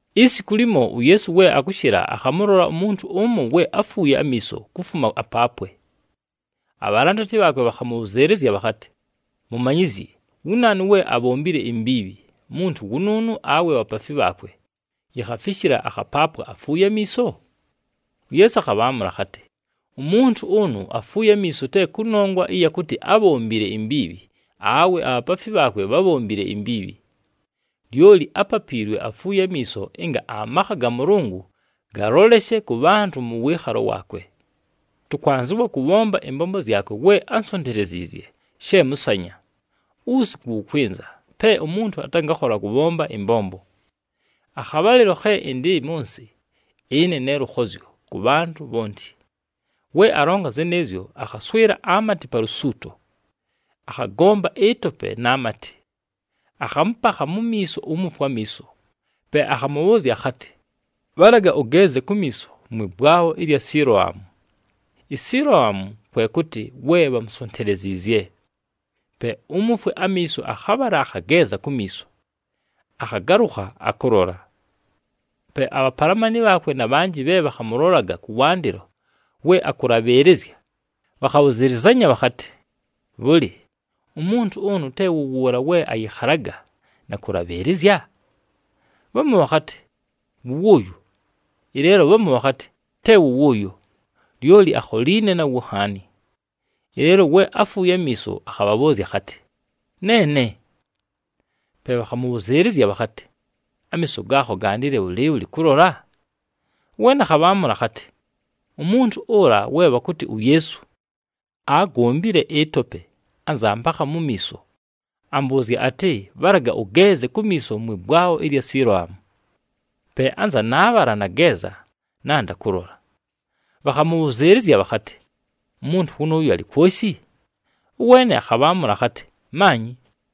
Isiku limo, uYeesu we akʉshɨla, akhamʉlola umuntu ʉmo we áfuuye amiiso kufuma apaapwe. Abhalandati bhaakwe bhakhamʉbhʉzɨɨlɨzya bhakhatɨ, “Mumanyizyi, wu naanu we abhombile imbiibhi, muntu wʉnʉʉnʉ, awe bhapaafi bhaakwe, yikhafishila akhapaapwa afuuye amiiso?” UYeesu akhabhaamʉla akhatɨ, “Umuntu ʉnʉ afuuye amiiso te kʉnongwa ɨya kʉtɨ ábhombile imbiibhi awe abhapaafi bhaakwe bhábhombile imbiibhi. Lyoli ápapiilwe afuuye amiiso ɨnga amakha ga Mʉlʉngʉ galoleshe kʉ bhantʉ mʉ wɨɨkhalo waakwe. Tʉkwanzɨwa kʉbhomba ɨmbombo zyakwe we ánsonteleziizye, she mʉsanya. Uwusiku wʉkwɨnza, pe umuntu atangakhola kʉbhomba ɨmbombo. Akhabhalɨlo khe ɨndɨ mʉ nsɨ, ɨne ne lʉkhozyo kʉ bhantʉ bhonti.” We alonga zɨnɨɨzyo, akhaswɨla amatɨ pa lusuuto, akhagomba ɨtope na matɨ, akhamʉpakha mu miiso umufwe amiiso. Pe akhamʉbhʉʉzya akhatɨ, “Bhalaga ʉgeeze kumiiso mwɨ bwabho ɨlya Siloamu.” ISiloamu kwe kʉtɨ, “we bhamusonteleziizye.” Pe umufwe amiiso akhabhala, akhageeza kumiiso, akhagalʉkha akʉlola. Pe abhapalamani bhaakwe na bhanjɨ bhe bhakhamʉlolaga kʉwandɨlo we akʉlabhɨɨlɨzya, bhakhabhʉzɨlɨzanya bhakhatɨ, “Bhʉlɨ, umuntu ʉnʉ te wʉ wʉʉla we ayɨkhalaga na kʉlabhɨɨlɨzya?” Bhamu bhakhatɨ, “Wʉ wʉʉyo.” Ɨleelo bhamu bhakhatɨ, “Te wʉ wʉʉyo, lyoli akholiine nawo nhaani.” Ɨleelo we afuuye amiiso akhabhabhʉʉzya akhatɨ, “Neene!” Pe bhakhamʉbhʉzɨɨlɨzya bhakhatɨ, “Amiiso gaakho gandile bhʉlɨɨbhʉlɨ kʉlola?” Ʉweene akhabhaamʉla akhatɨ, “Umuntu ʉla we bhakʉtɨ uYeesu, aagombile ɨtope anza ampakha mu miiso. Ambʉʉzya atɨ, ‘Bhalaga ʉgeeze kumiiso mwɨ bwabho ɨlya Siloamu.’ Pe anza naabhala, nageeza, nanda kʉlola.” Bhakhamʉbhʉzɨɨlɨzya bhakhatɨ, “Umuntu wʉnʉʉyo alɨ kwoshi?” Ʉweene akhabhaamʉla akhatɨ, “Maanyi!”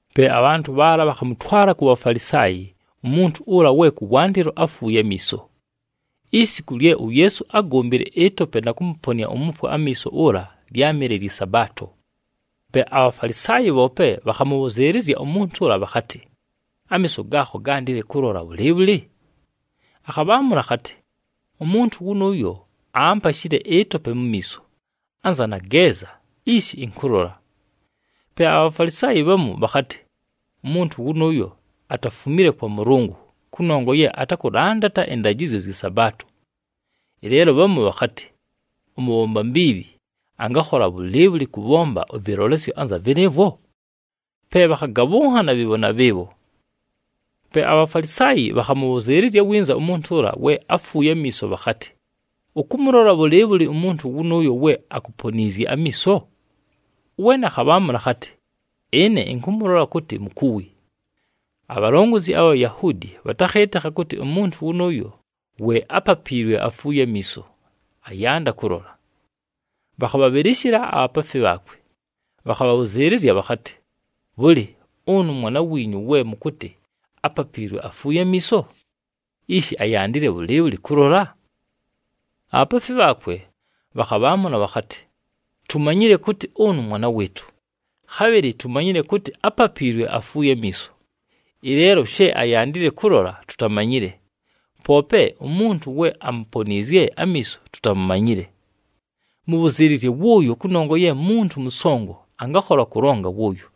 Pe abhantʉ bhaala bhakhamʉtwala ku Bhafalisaayi umuntu ʉla we kʉwandɨlo áfuuye amiiso. Isiku lye uYeesu ágombile ɨtope na kʉmʉponɨa umufwe amiiso ʉla lyámɨle lyɨ Sabaato. Pe aBhafalisaayi bhoope bhakhamʉbhʉzɨɨlɨzya umuntu ʉla bhakhatɨ, “Amiiso gaakho gandile kʉlola bhʉlɨɨbhʉlɨ?” Akhabhaamʉla akhatɨ, “Umuntu wʉnʉʉyo aampashile ɨtope mu miiso, anza nageeza, ishi ɨnkʉlola.” Pe aBhafalisaayi bhamu bhakhatɨ, “Umuntu wʉnʉʉyo atafumile kwa Mʉlʉngʉ kʉnongwa ye atakʉlandata ɨndajɨzyo zyɨ Sabaato.” Ɨleelo bhamu bhakhatɨ, “Ʉmʉbhomba mbiibhi angakhola bhʉlɨɨbhʉlɨ kʉbhomba ɨvɨlolesyo anza vɨnɨɨvwo?” Pe bhakhagabhʉnhana bhɨɨbho na bhɨɨbho. Pe aBhafalisaayi bhakhamʉbhʉzɨɨlɨzya winza umuntu we áfuuye amiiso bhakhatɨ, “Ʉkʉmʉlola bhʉlɨɨbhʉlɨ umuntu wʉnʉʉyo we akuponiizye amiiso?” Ʉweene akhabhaamʉla akhatɨ, “Ɨne ɨnkʉmʉlola kʉtɨ mukuwi.” Abhalongozi abha Bhayahuudi bhatakhɨɨtɨkha kʉtɨ umuntu wʉnʉʉyo we ápapiilwe afuuye amiiso, ayanda kʉlola. Bhakhabhabhɨlɨshɨla abhapaafi bhaakwe, bhakhabhabhʉzɨɨlɨzya bhakhatɨ, “Bhʉlɨ, ʉnʉ mwana wiinyu we mʉkʉtɨ ápapiilwe afuuye amiiso? Ishi ayandile bhʉlɨɨbhʉlɨ kʉlola?” Abhapaafi bhaakwe bhakhabhaamʉla bhakhatɨ, “Tumanyile kʉtɨ ʉnʉ mwana wɨɨtʉ, khabhɨlɨ tumanyile kʉtɨ ápapiilwe afuuye amiiso. Ɨleelo she ayandile kʉlola tutamanyile, poope umuntu we amuponiizye amiiso tutamumanyile. Mʉbhʉzɨɨlɨzye wʉʉyo, kʉnongwa ye muntu mʉsongo, angakhola kʉlonga wʉʉyo.”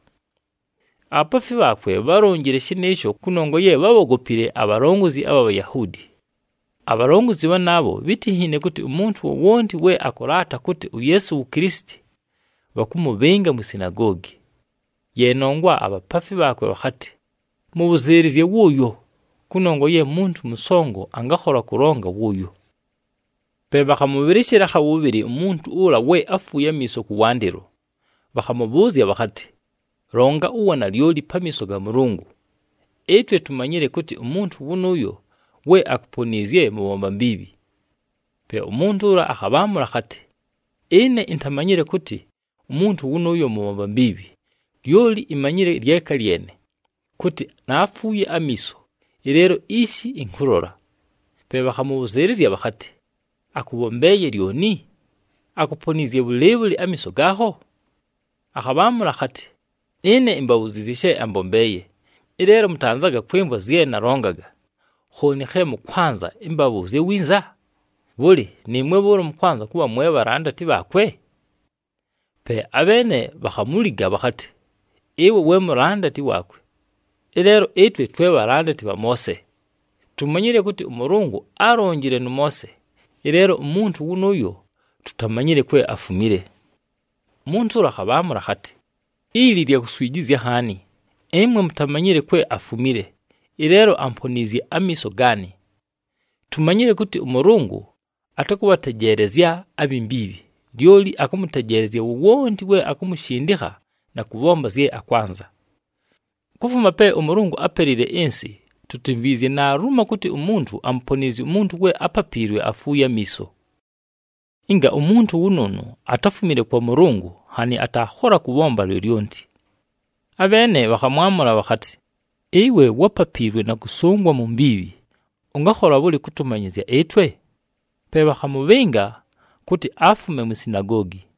Abhapaafi bhaakwe bhálonjile shɨnɨɨsho kʉnongwa ye bhábhogopile abhalongozi abha Bhayahuudi. Abhalongozi bhanaabho bhítinhiine kʉtɨ umuntu wowonti we akʉlaata kʉtɨ uYeesu wu Kilisiti, bhakʉmʉbhɨnga mwi sinagoogi. Ye nongwa abhapaafi bhaakwe bhakhatɨ, “Mʉbhʉzɨɨlɨzye wʉʉyo, kʉnongwa ye muntu mʉsongo, angakhola kʉlonga wʉʉyo.” Pe bhakhamʉbhɨlɨshɨla akha wʉbhɨlɨ umuntu ʉla we áfuuye amiiso kʉwandɨlo, bhakhamʉbhʉʉzya bhakhatɨ, “Longa uwanalyoli pamiiso ga Mʉlʉngʉ! Ɨtwe tumanyile kʉtɨ umuntu wʉnʉʉyo we akuponiizye mʉbhomba mbiibhi.” Pe umuntu ʉla akhabhaamʉla akhatɨ, “Ɨne intamanyile kʉtɨ umuntu wʉnʉʉyo mʉbhomba mbiibhi, lyoli imanyile lyeka lyene, kʉtɨ naafuuye amiiso, ɨleelo ishi ɨnkʉlola.” Pe bhakhamʉbhʉzɨɨlɨzya bhakhatɨ, “Akʉbhombeeye lyoni? Akuponiizye bhʉlɨɨbhʉlɨ amiiso gaakho?” Akhabhaamʉla akhatɨ, “Ɨne imbabhuziizye she ambombeeye, ɨleelo mʉtanzaga kwɨmvwa zye nalongaga. Khooni khe mʉkwanza ɨmbabhʉʉzye winza? Bhʉlɨ, nɨɨmwe bhʉʉlo mʉkwanza kʉbha mwe bhalandati bhaakwe?” Pe abheene bhakhamuliga bhakhatɨ, “Ɨwe we mulandati waakwe! Ɨleelo ɨtwe twe bhalandati bha Moose. Tumanyile kʉtɨ ʉMʉlʉngʉ álonjile nʉ Moose, ɨleelo umuntu wʉnʉʉyo tutamanyile kwe afumile.” Umuntu ʉla akhabhaamʉla akhatɨ, “Ili lya kuswijizya nhaani! Ɨmwe mutamanyile kwe afumile, ɨleelo amponiizye amiiso gaanɨ! Tumanyile kʉtɨ ʉMʉlʉngʉ atakʉbhatejeelezya abhi mbiibhi, lyoli akʉmʉtejeelezya wowonti we akumushindikha na kʉbhomba zye akwanza. Kufuma pe ʉMʉlʉngʉ ápelile ɨnsɨ, tutimvwizye naalumo kʉtɨ umuntu amuponiizye umuntu we ápapiilwe afuuye amiiso. Ɨnga umuntu wʉnʉʉnʉ atáfumile kwa Mʉlʉngʉ, nhanɨ ataakhola kʉbhomba lyolyonti.” Abheene bhakhamwamʉla bhakhatɨ, “Ɨwe wápapiilwe na kʉsʉngwa mu mbiibhi. Ʉngakhola bhʉlɨ kʉtʉmanyɨzya ɨtwe?” Pe bhakhamʉbhɨnga kʉtɨ afume mwi sinagoogi.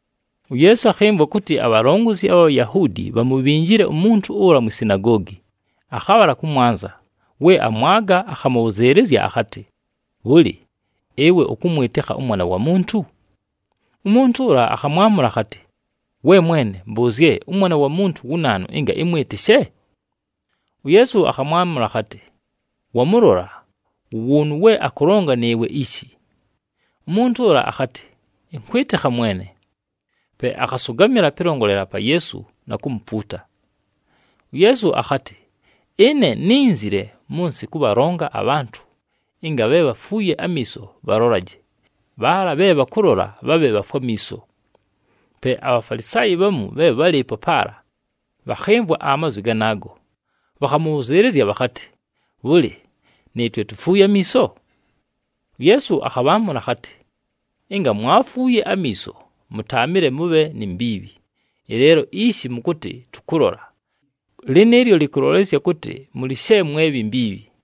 UYeesu akhɨmvwa kʉtɨ abhalongozi abha Bhayahuudi bhamubhinjile umuntu ʉla mwi sinagoogi. Akhabhala kʉmwanza, we amwaga, akhamʉbhʉzɨɨlɨzya akhatɨ, “Bhʉlɨ, ɨwe ʉkʉmwɨtɨkha ʉMwana wa Muntu?” Umuntu ʉla akhamwamʉla akhatɨ, “We mwene, mbʉʉzye ʉMwana wa Muntu wu naanu, ɨnga ɨmwɨtɨshe?” UYeesu akhamwamʉla akhatɨ, “Wamʉlola, wʉ wʉʉnʉ we akʉlonga nɨɨwe ishi.” Umuntu ʉla akhatɨ, “Ɨnkwɨtɨkha, Mwene!” Pe akhasʉgamɨla pɨlongolela pa Yeesu na kumupuuta. UYeesu akhatɨ, “Ɨne nínzile mʉ nsɨ kʉbhalonga abhantʉ, ɨnga bhe bhafuuye amiiso bhalolaje, bhaala bhe bhakʉlola, bhabhe bhafwe amiiso.” Pe aBhafalisaayi bhamu bhe bhálɨɨpo paala bhakhɨmvwa amazwi ganaago, bhakhamʉbhʉzɨɨlɨzya bhakhatɨ, “Bhʉlɨ, nɨɨtwe tufuuye amiiso?” UYeesu akhabhaamʉla akhatɨ, “Ɨnga mwaafuuye amiiso, mʉtaamɨle mʉbhe ni mbiibhi. Ɨleelo ishi mʉkʉtɨ, ‘Tʉkʉlola,’ lɨnɨɨlyo lɨkʉlolesya kʉtɨ mʉlɨ she mwe bhi mbiibhi.”